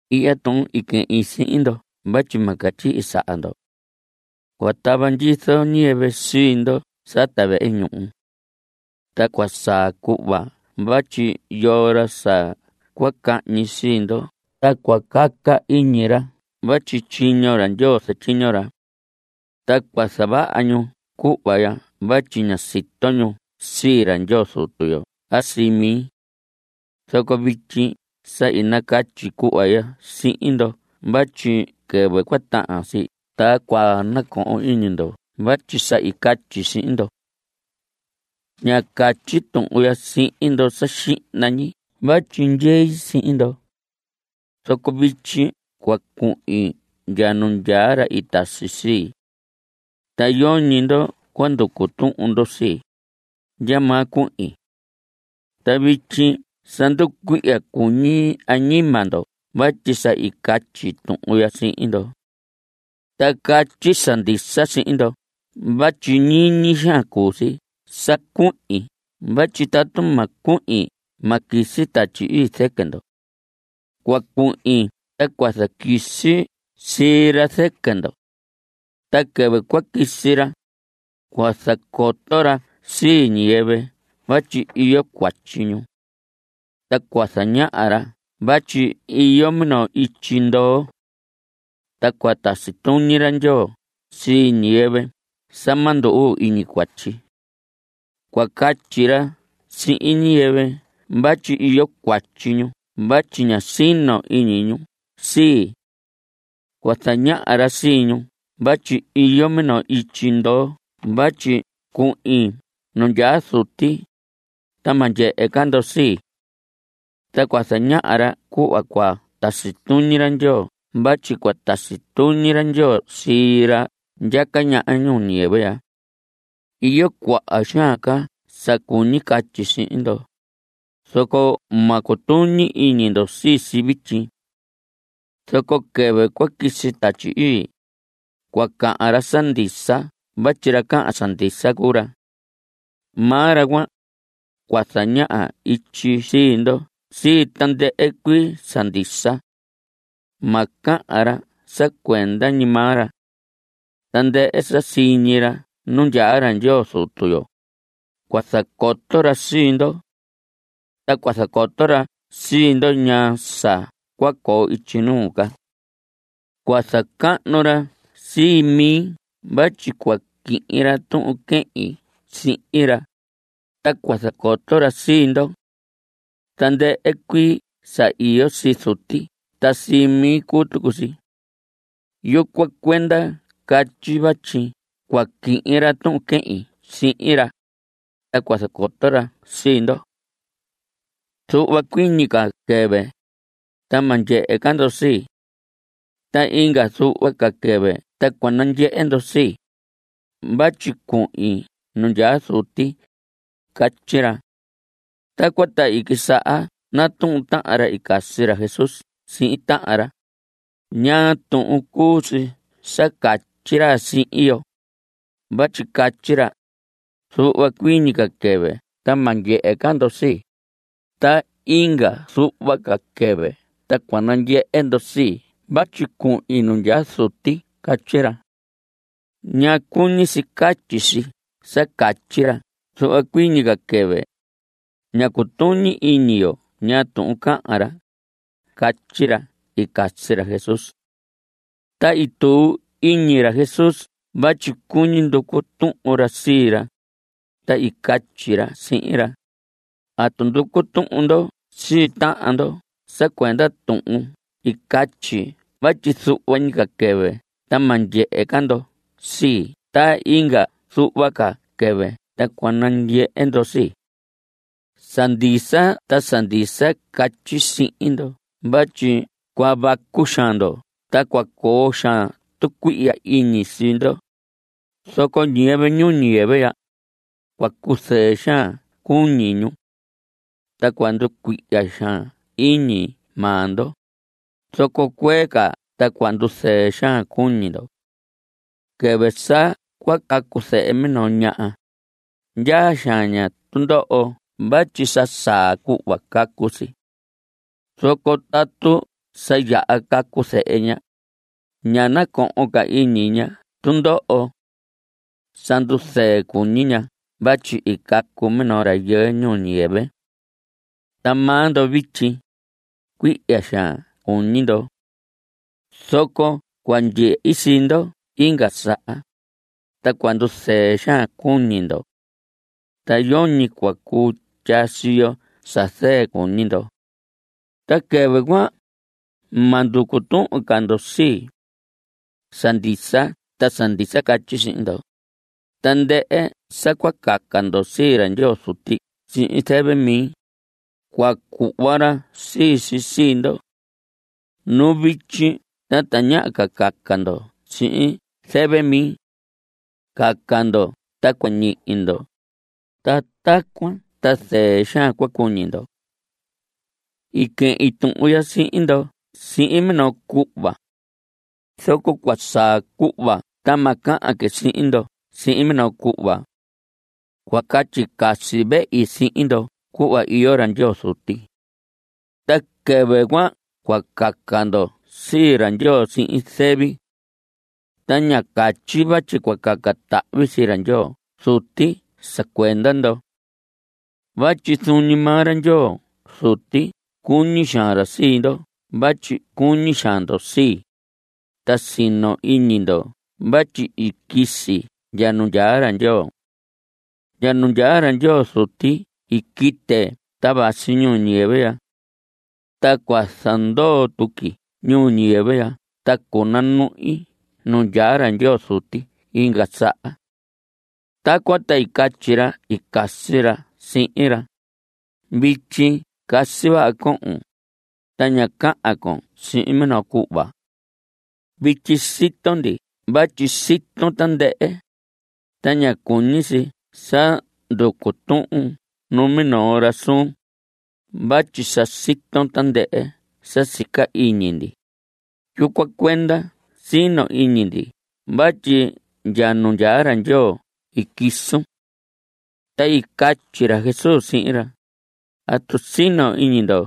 Ihya tuhun i quehin sihin ndo vatyi ma catyihi saha ndo. Cua tava ndyizo ñiyɨvɨ sii ndo sata vehe ñuhu. Ta cua saa cuhva vatyi yoo ra sa cua cahñi sii ndo ta cua caca iñi ra vatyi tyiño ra Ndyoo zatyiño ra. Ta cua zavaha ñu cuhva ya vatyi ña sito ñu sii ra Ndyoo Zutu yo a sii mi. Zoco vityi sa i nacatyi cuhva ya sihin ndo vatyi quɨvɨ cua tahan si ta cua nacohon iñi ndo vatyi sa i catyi sihin ndo. Ñá catyi tuhun ya sihin ndo sa xihna ñi vatyi ndyei sihin ndo. Zoco vityi cua cuhin ndya nu ndyaa ra i tasi sii. Ta yoñi ndo cua nducu tuhun ndo sii, ndyamaa cuhin. Ta vityi sa nducuihya cuñi añima ndo vatyi sa i catyi tuhun ya sihin ndo. Ta catyi sa ndisa sihin ndo vatyi ñiñi xaan cuu si sa cuhin vatyi tatu ma cuhin ma quisi Tatyi Ii zɨquɨ ndo. Cua cuhin ta cua zaquisi sii ra zɨquɨ ndo. Ta quɨvɨ cua quisi ra, cua zacoto ra sii ñiyɨvɨ vatyi iyo cuatyi ñu. Ta cua zañaha ra vatyi iyo minoo ityi ndoo. Ta cua tasi tuñi ra Ndyoo sii ñiyɨvɨ sa ma ndu‑uu iñi cuatyi. Cua catyi ra sihin ñiyɨvɨ vatyi iyo cuatyi ñu vatyi ña sino iñi ñu sii. Cua zañaha ra sii ñu vatyi iyo minoo ityi ndoo vatyi cuhin nu ndyaa Zuti, ta ma ndyehe ca ndo sii. Ta cua zañaha ra cuhva cua tasi tuñi ra Ndyoo vatyi cua tasi tuñi ra Ndyoo sii ra ndyaca ñaha ñuu ñiyɨvɨ ya. Iyo cuaha xaan ca sa cuñi catyi sihin ndo, zoco ma cutuñi iñi ndo sii si vityi. Zoco quɨvɨ cua quisi Tatyi Ii, cua cahan ra sa ndisa vatyi ra cahan sa ndisa cuu ra. Maa ra cuan, cua zañaha ityi sii ndo sii tandɨhɨ cuii sa ndisa. Ma cahan ra sa cuenda ñi maa ra. Tandɨhɨ sa siñi ra nu ndyaa ra Ndyoo Zutu yo, cua zacoto ra sii ndo. Ta cua zacoto ra sii ndo ñaa sa cua coo ityi nuu ca. Cua zacahnu ra sii mi vatyi cua quihin ra tuhun quehin sihin ra, ta cua zacoto ra sii ndo. Tandɨhɨ cuii sa iyo sii Zuti ta sii mi cuu tucu si. Yucuan cuenda catyi vatyi cua quihin ra tuhun quehin sihin ra, ta cua zacoto ra sii ndo. Zuhva cuii ñi ca quɨvɨ, ta ma ndyehe ca ndo sii. Ta inga zuhva ca quɨvɨ ta cua nandyehe ndo sii, vatyi cuhin nu ndyaa Zuti. Catyi ra. Tacuan ta i quisaha natuhun tahan ra i casi ra Jesús sihin tahan ra: ¿Ñaa tuhun cuu si sa catyi ra sihin yo? vatyi catyi ra: “Zuhva cuii ñi ca quɨvɨ ta ma ndyehe ca ndo sii, ta inga zuhva ca quɨvɨ ta cua nandyehe ndo sii vatyi cuhin nu ndyaa Zuti”. Catyi ra. ¿Ñaa cuñi si catyi si sa catyi ra zuhva cuii ñi ca quɨvɨ? Ña cutuñi iñi yo ñaa tuhun cahan ra. Catyi ra i casi ra Jesús. Ta i tuu iñi ra Jesús vatyi cuñi nducu tuhun ra sii ra, ta i catyi ra sihin ra: ¿Atu nducu tuhun ndo sii tahan ndo sa cuenda tuhun i catyi vatyi zuhva ñi ca quɨvɨ ta ma ndyehe ca ndo sii ta inga zuhva ca quɨvɨ ta cua nandyehe ndo sii? Sa ndisa ta sa ndisa catyi sihin ndo vatyi cua vacu xaan ndo ta cua coo xaan tucuihya iñi sii ndo, zoco ñiyɨvɨ ñuu ñiyɨvɨ ya, cua cuzɨɨ xaan cuñi ñu. Ta cua nducuihya xaan iñi maa ndo, zoco cuee ca ta cua nduzɨɨ xaan cuñi ndo. Quɨvɨ sa cua cacu zehe minoo ñaha, ndyaa xaan ña tundoho vatyi sa saa cuhva cacu si. Zoco tatu sa yaha cacu zehe ña, ña nacohon ca iñi ña tundoho. Sa nduzɨɨ cuñi ña vatyi i cacu minoo rayɨɨ ñuu ñiyɨvɨ. Ta maa ndo vityi, cuihya xaan cuñi ndo. Zoco cua ndyehi sii ndo inga saha, ta cua nduzɨɨ xaan cuñi ndo. Ta yoñi cua cuu tyaa siyo sa zɨɨ cuñi ndo. Ta quɨvɨ cuan, ma nducu tuhun ca ndo sii. Sa ndisa ta sa ndisa catyi sihin ndo, tandɨhɨ sa cua caca ndo sii ra Ndyoo Zuti sihin zɨvɨ mi, cua cuhva ra sii si sii ndo. Nu vityi ta tañaha ca caca ndo sihin zɨvɨ mi. Caca ndo ta cua ñihi ndo, ta tacuan ta zɨɨ xaan cua cuñi ndo. I quehin tuhun ya sihin ndo sihin minoo cuhva. Zoco cua saa cuhva ta ma cahan que sihin ndo sihin minoo cuhva. Cua catyi casi vehi sihin ndo cuhva iyo ra Ndyoo Zuti. Ta quɨvɨ cuan cua caca ndo sii ra Ndyoo sihin zɨvi. Ta ña catyi vatyi cua caca tahvi sii ra Ndyoo Zuti sa cuenda ndo vatyi zuun ñi maa ra Ndyoo Zuti cuñi xaan ra sii ndo vatyi cuñi xaan ndo sii, ta sino iñi ndo vatyi i quisi ndya nu ndyaa ra Ndyoo. Ndya nu ndyaa ra Ndyoo Zuti i quite ta vasi ñuu ñiyɨvɨ. Ta cua zandoo tuqui ñuu ñiyɨvɨ ya ta cunanuhi nu ndyaa ra Ndyoo Zuti inga saha. Tacuan ta i catyi ra i casi ra sihin ra: Vityi casi vaha cohon, ta ña cahan con sihin minoo cuhva. Vityi sito ndi vatyi siton tandɨhɨ, ta ña cuñi si sa nducu tuhun numinoo ra suun (vatyi sa siton tandɨhɨ sa sica iñi ndi). Yucuan cuenda sino iñi ndi vatyi ndya nu ndyaa ra Ndyoo i quisun. Ta i catyi ra Jesús sihin ra: ¿Atu sino iñi ndo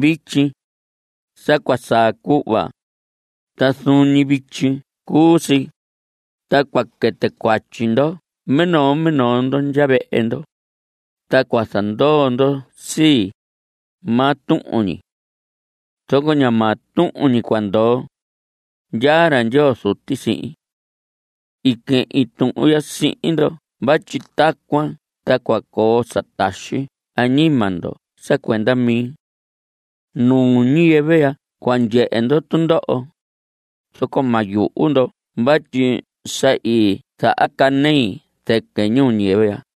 vityi? Sa cua saa cuhva, ta zuun ñi vityi cuu si, ta cua quɨtɨ cuatyi ndo minoo minoo ndo ndya vehe ndo, ta cua zandoo ndo sii, maa tuhun ñi. Zoco ña maa tuhun ñi cua ndoo. Ndyaa ra Ndyoo Zuti sihin. I quehin tuhun ya sihin ndo vatyi tacuan ta cua coo sa taxi añima ndo sa cuenda mi. Ñuu ñiyɨvɨ ya cua ndyehe ndo tundoho, zoco ma yuhu ndo vatyi sa i zahacanei zɨquɨ ñuu ñiyɨvɨ ya.